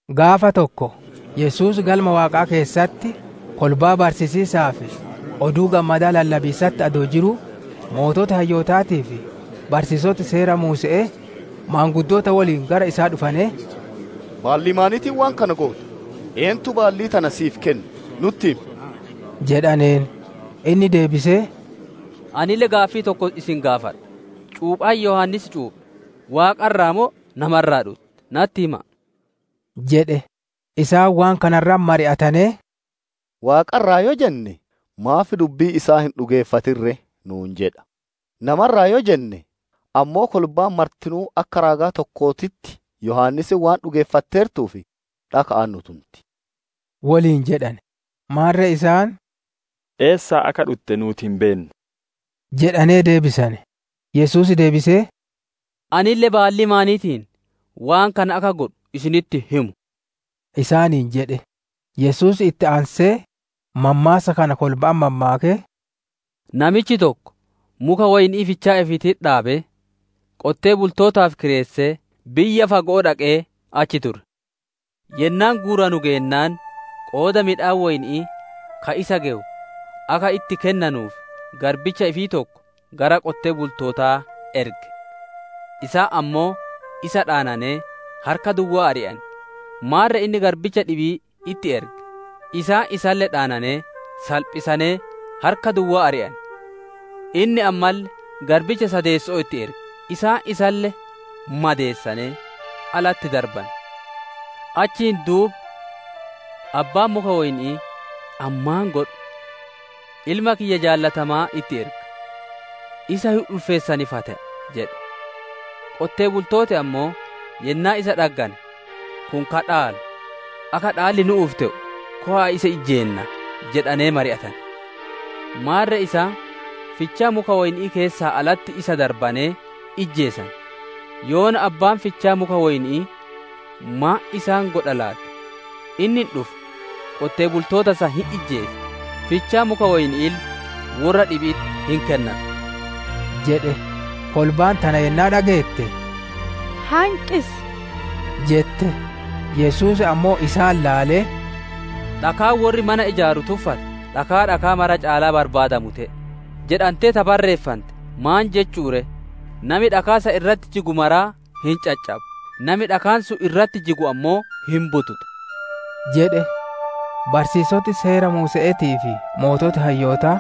Gaafa tokko Yesuus Galma Waaqaa keessatti kolbaa barsiisiisaa fi Oduu Gammadaa lallabiisatti adoo jiruu, sooreyyiin hayyootaatii fi barsiisoti Seera Muuse'ee, maanguddoota woliin gara isaa dhufanee, «Baallii maaniitiin waan kana goota? Eentu baallii tana si'iif kenne? Nutti himi!» jedhaneen. Inni deebisee, «Anille gaaffii tokko isin gaafadha; cuuphaan Yohaannis cuuphe Waaqa irraa moo, nama irraa dhutte? Natti hima'a!» jedhe. Isaan waan kana irratti mari'atanee, « ‹Waaqa irraa› yoo jenne, ‹Maaf dubbii isaa hin dhugeeffatin ree?› nuun jedha. ‹Nama irraa› yoo jenne ammoo, kolbaan martinuu akka raagaa tokkootitti Yohaannis waan dhugeeffatteertuuf, dhaka'aan nu tunti» woliin jedhane. Maarre isaan, «Eessaa akka dhutte nuuti hin beennu» jedhanee deebisane. Yesuus deebisee, «Anille baallii maaniitiin waan kana akka godhu isinitti hin himu» isaaniin jedhe. Yesuus itti aansee mammaassa kana kolba'atti mammaakee, «Namichi tokko muka woyni'ii fichaa ifiititti dhaabee, qonnaan bultootaaf kireessee, biyya fago'oo dhaqee achi ture. Yennaan guuranu geennaan, qooda midhaan woyni'ii ka isa gewu akka itti kennanuuf garbicha ifii tokko gara qonnaan bultootaa erge. Isaan ammoo isa dhaananee harka duwwaa ari'ane. Maarre inni garbicha dhibii itti erge; isaan isalle dhaananee salphisanee harka duwwaa ari'ane. Inni ammalle garbicha sadeesso'oo itti erge; isaan isaalle madeessanee alatti darbane. Achiin duuba abbaan muka woyni'ii, ‹Ani maan godhu? Ilma kiyya jaalatamaa itti erga; isa hin ulfeessan fa te'a› jedhe. Qonnaan bultooti ammoo yennaa isa dhaggane, ‹Kun ka dhaalu; akka dhaalli nu'uuf te'u, kowaa isa ijjeennaa!› jedhanee mari'atane. Maarre isaan fichaa muka woyni'ii keessaa alatti isa darbanee ijjeesane. «Yoona abbaan fichaa muka woyni'ii maan isaan godha laati? Inni hin dhufa, qonnaan bultoota san hin ijjeesa, fichaa muka woyni'iille worra dhibi'itti hin kennata» jedhe. Kolbaan tana yennaa dhageette, «Hanqisi!» jette. Yesuus ammoo isaan laalee, «‹Dhakaan worri mana ijaaru tuffate, dhakaa dhakaa maraa caalaa barbaadamu te'e› jedhante ta barreeffante maan jechu'u ree? Nami dhakaa san irratti jigu maraa hin caccaba; nami dhakaan sun irratti jigu ammoo hin bututa» jedhe. Barsiisoti Seera Muuse'eetii fi sooreyyiin hayyootaa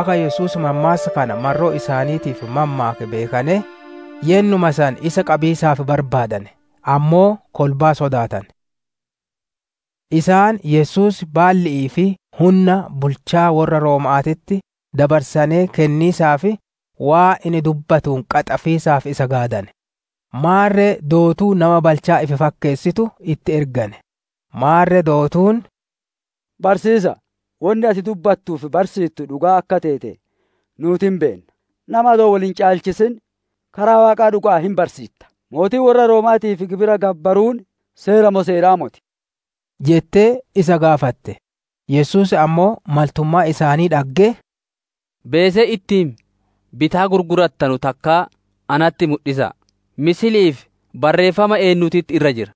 akka Yesuus mammaassa kana marroo isaaniitiif mammaake beekanee, yennuma san isa qabiisaaf barbaadane; ammoo kolbaa sodaatane. Isaan Yesuus baalli'ii fi hunna bulchaa worra Rooma'aatitti dabarsanee kenniisaaf, waan inni dubbatuun qaxafiisaaf isa gaadane; maarre dootuu nama balchaa ifi fakkeessitu itti ergane. Maarre dootuun, «Barsiisa'a, wonni ati dubbattuu fi barsiittu dhugaa akka teete nuuti hin beenna; nama adoo wol hin caalchisin karaa Waaqaa dhuga'aan hin barsiitta. Mootii worra Rooma'aatiif gibira gabbaruun seera moo seeraa moti?» jettee isa gaafatte. Yesuus ammoo maltummaa isaanii dhaggee, «Beesee ittiin bitaa gurgurattanu takka natti mudhisa'a; Fakki'ii fi barreeffama eennuutitti irra jira?»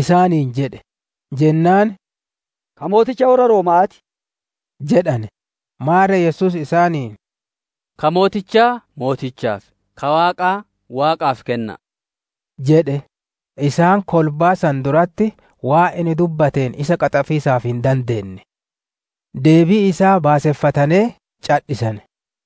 isaaniin jedhe. Jennaan, «Ka mooticha worra Rooma'aati» jedhane. Maarre Yesuus isaaniin, «Ka mootichaa mootichaaf, ka Waaqaa Waaqaaf kenna'a!» jedhe. Isaan kolbaa san duratti waan inni dubbatteen isa qaxafiisaaf hin dandeenne. Deebii isaa baaseffatanee cadhisane.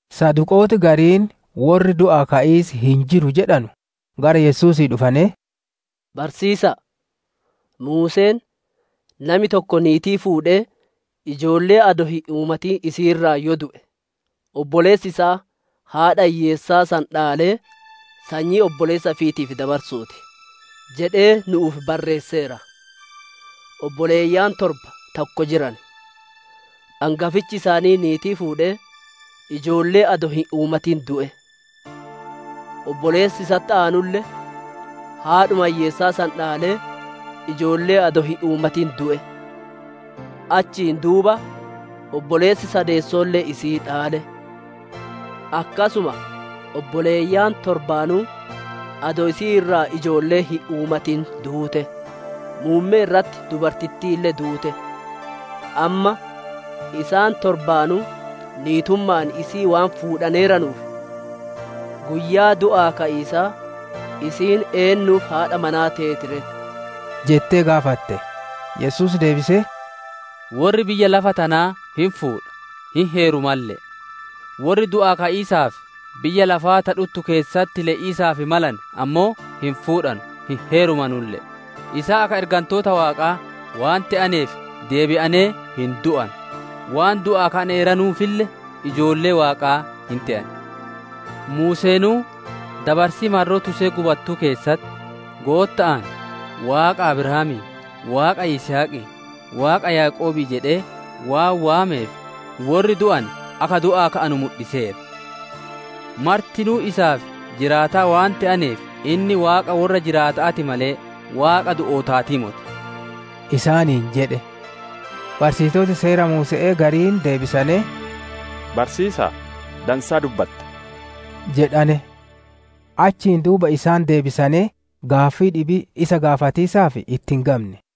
Saduqooti gariin, worri du'aa ka'iis hin jiru jedhanu, gara Yesuusii dhufanee, «Barsiisa'a, Muuseen, ‹Nami tokko niitii fuudhee ijoollee adoo hin uumatin isii irraa yoo du'e, obboleessi isaa haadha hiyyeessaa san dhaalee sanyii obboleessa ifiitiif dabarsuuti› jedhee nu'uuf barreesseera. Obboleeyyan torba, tokko jiran. Angafichi isaanii niitii fuudhee ijoollee adoo hin uumatin du'e. Obboleessi isatti aanulle, haadhuma hiyyeessaa san dhaalee ijoollee adoo hin uumatin du'e; achiin duuba obboleessi sadeesso'oolle isii dhaale. Akkasuma obboleeyyan torbaanuu adoo isii irraa ijoollee hin uumatin duute. Muummee irratti dubartittiille duute. Amma, isaan torbaanuu niitumma'aan isii waan fuudhaneeranuuf, guyyaa du'aa ka'iisaa isiin eennuuf haadha manaa teeti ree?» jettee gaafatte. Yesuus deebisee, «Worri biyya lafa tanaa hin fuudha, hin heerumalle'e; worri du'aa ka'iisaa fi biyya lafaa ta dhuttu keessatti le'iisaaf malane ammoo, hin fuudhanu, hin heerumanulle'e. Isaan akka ergantoota Waaqaa waan te'aneef, deebi'anee hin du'anu; waan du'aa ka'aneeranuufille ijoollee Waaqaa hin te'an. Muuseenuu, dabarsii marroo tusee gubattuu keessatti, Gootta'aan, ‹Waaqa Abrahaamii, Waaqa Yisihaqii, Waaqa Yaaqoobii› jedhee waan waameef, worri du'ane akka du'aa ka'anu mudhiseera. Martinuu isaaf jiraataa waan te'aneef, inni Waaqa worra jiraata'aa ti malee Waaqa du'ootaatii moti» isaaniin jedhe. Barsiisoti Seera Muuse'ee gariin deebisanee, «Barsiisaa, dansaa dubbatte» jedhane. Achiin duuba isaan deebi'anee gaaffii dhibii isa gaafatiisaaf itti hin gamne.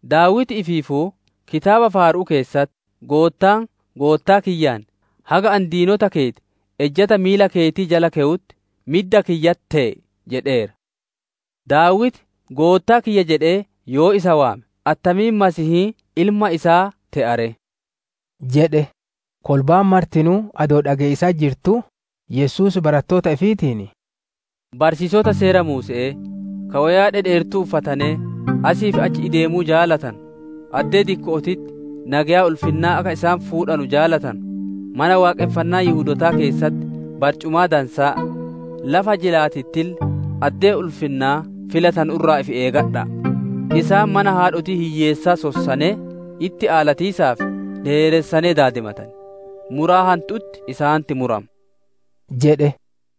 Daawiti ifiifuu kitaaba faaru'uu keessatti, «‹Goottaan Goottaa kiyyaan, «Haga ani diinota keeti ejjata miila keetii jala kewutti, midda kiyyatti tee'i» jedheera› jedhe. Daawiti, ‹Goottaa kiyya› jedhee yoo isa waame, attamiin Masiihiin ilma isaa te'a ree?» jedhe. Kolbaan martinuu adoo dhage'iisatti jirtuu, Yesuus baratoota ifiitiin, «Barsiisota Seera Muuse'ee, ka woyaa dhedheertuu uffatanee asii fi achi ideemuu jaalatanu, addee dikko'ootitti nageya ulfinnaa akka isaan fuudhanu jaalatanu, Mana Waaqonfannaa Yihudootaa keessatti barcumaa dansaa, lafa jilaatittille addee ulfinnaa filatanu irraa ifi eegadha'a! Isaan mana haadhotii hiyyeessaa sossanee, itti aalatiisaaf dheeressanee daadimatan. Muraa hantu'utti isaanitti murama» jedhe.